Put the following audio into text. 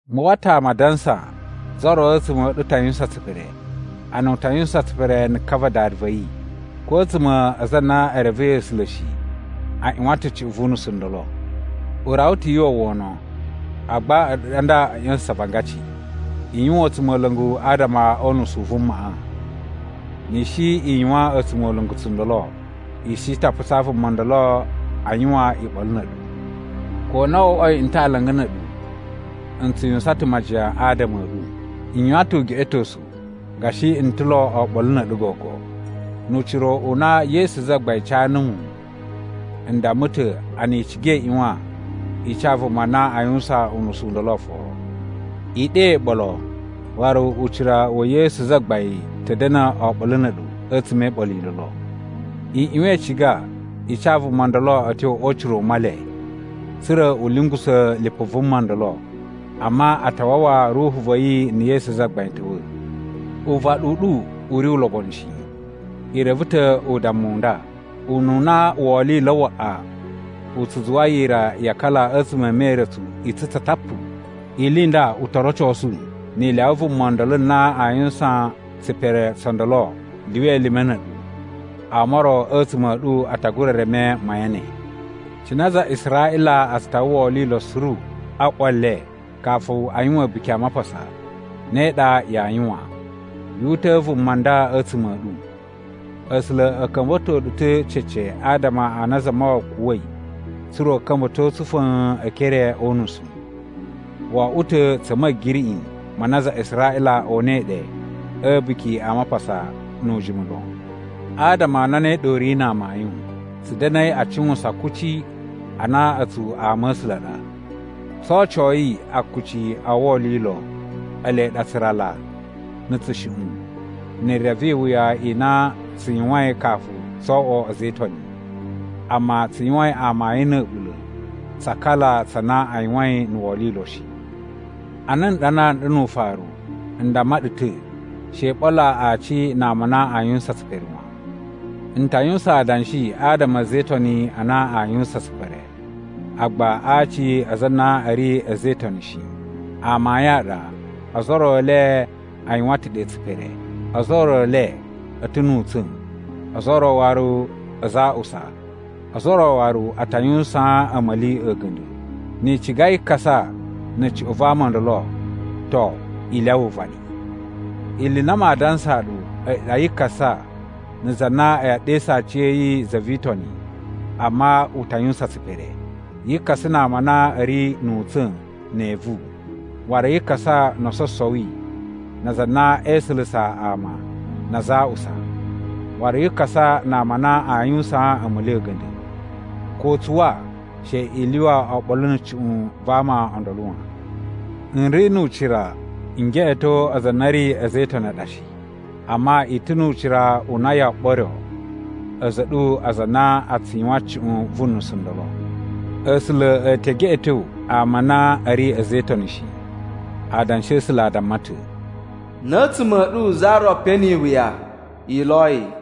Mu uwwa ta̱ ama a dansa za ro a̱tsuma̱ a̱ ɗu ta yuwusan tsipere, a na u ta yuwusan tsipere na̱ ka va dada va̱ yi. Ko a̱tsuma̱ a aza a na e revei A̱sula̱ shi a ꞌyuwan ta̱ cuꞌun vu unusu u ndolo. U rawa ta̱ yu uwwa wono, agba a̱ɗu ɗa nda a̱ ꞌya̱sa̱sa̱n avangaci. I yuwan a̱tsumola̱ngu adama o unusu u vumaꞌa. Ni i shi i yuwan a̱tsumola̱ngu tsundolo, i shi ta putsaa vuma ndolo a yuwan iɓolo na̱ a̱ɗu. Ko na wo oꞌwoi n ta̱ alanga na̱ a̱ɗu, n tsu yuwusan ta̱ majiyan adama a̱ ɗu. N yuwan ta̱ ugeꞌetosu gashi n ta̱ lo oɓolo na̱ a̱ɗu gogo. Nu ucira u na Yesu Zagbain ca numu, n damma ta̱ a na i ciga i ꞌyuwan i ca vuma na aa yuwusan unusu u ndolo oforo. I ɗe iɓolo waru ucira wa̱ Yesu Zagbain ta̱ da̱na̱ oɓolo na̱ a̱ɗu a̱tsuma̱ e iɓolo i ndolo. I ꞌyuwan i ciga i ca vuma ndolo a̱ tyo o ucira u Male, tsa̱ra̱ u lungusa̱ lipu vuma ndolo, amma a ta wawa ruhu va̱ yi na̱ Yesu Zagbain ta̱wa̱. Uvaɗu u ɗu u ri ulobonu shi. I reve ta̱ udammu u nda, “Ununa wolilo waꞌa u tsu zuwa yira ya akala a̱tsuma̱ e meretsu i tsutsa tapu.” Ili i nda u to rocosu ni i lyawa vuma ndolo na aa yuwusan tsipere tso ndolo lyuwa elime na̱ a̱ɗu, ama o ro a̱tsuma̱ a̱ ɗu a ta gura reme mayan ne. Cine aza a Israꞌila a tsu tawa wolilo suru a ꞌwa le kafu a yuwan A̱buki a Mapasa, ne ɗa yaa yuwan, yu uta̱a̱ vuma nda a̱tsuma̱ a̱ ɗu. A̱sula̱ a̱ ka̱mba̱to ɗu ta̱ cece adama a na Zamawawa kuwa̱i tsa̱ra̱ u ka̱mba̱to tsu fa̱a̱n e ekere o unusu. Wo oꞌwo ta̱ tsa̱ ma̱giriꞌi ma na aza a Israꞌila o unai ɗe a̱ A̱buki a Mapasa nu ujimu lon. Adama a na ne ɗa u ri na amayun, tsu da̱na̱i a cuwusan kuci a na a̱tsu ama a̱ A̱sula̱ a ɗa. Tso ocoyi akuci o wolilo, ele ɗa tsurala, na̱ tsushuꞌun, na̱ re vi iwuya i na tsu yuwain kafu tso oꞌwo a̱za̱ e Itoni, amma tsu yuwain amayun na̱ a̱ɓula̱ tsa akala tsa na a yuwain na̱ wolilo shi. Ana n ɗanaa nɗu nu ufaru, n damma ɗu ta̱ she i ɓolo aci na ama a na aa yuwusan tsipere wan. N ta yuwusan adanshi adama a̱ a̱za̱ e Itoni a na a yuwusan tsipere, agba a aci a aza a na a̱ ri a̱za̱ e Itoni shi. Amayun a ɗa ozo o ro e le a yuwan ta̱ ɗe tsipere. Ozo o ro e le a̱ ta̱ nu utsa̱n, ozo o ro waru aza a aꞌusa, ozo o ro waru a ta yuwusaan a̱ma̱li a̱ga̱nda̱. Ni i ciga yi kasa na̱ cuꞌun va ama o ndolo, to i lyawa uvaɗi. Ili i na maa dansaa ɗu a̱yi ɗa yi kasa na za na e ɗesu aciya̱yi za vi Itoni amma u ta yuwusan tsipere. Yi kasa na ama a na a̱ ri nu utsa̱n ne evu. Waru yi kasa no ososowi na aza a na e isulusa ama na aza a aꞌusa. Waru yi kasa na ama a na yuwusaan a̱ma̱li a̱ga̱nda̱. Ko tsuwa she i lyuwa oɓolo na̱ cuꞌun va ama o ndolo wan. N ri nu ucira n geꞌeto aza a na a̱ ri a̱za̱ e Itoni a ɗa shi. Amma i ta̱ nu ucira u na yoo ɓoryo a̱za̱ a̱ ɗu aza a na a tsu yuwan cuꞌun vu nusu ndolo. A̱sula̱ a̱ te geꞌeto ama a na a̱ ri a̱za̱ e Itoni shi. Adanshi a̱ A̱sula̱ a damma ta̱, “Na̱ a̱tsuma̱ a̱ ɗu za ro pe ni iwuya, i lo yi.”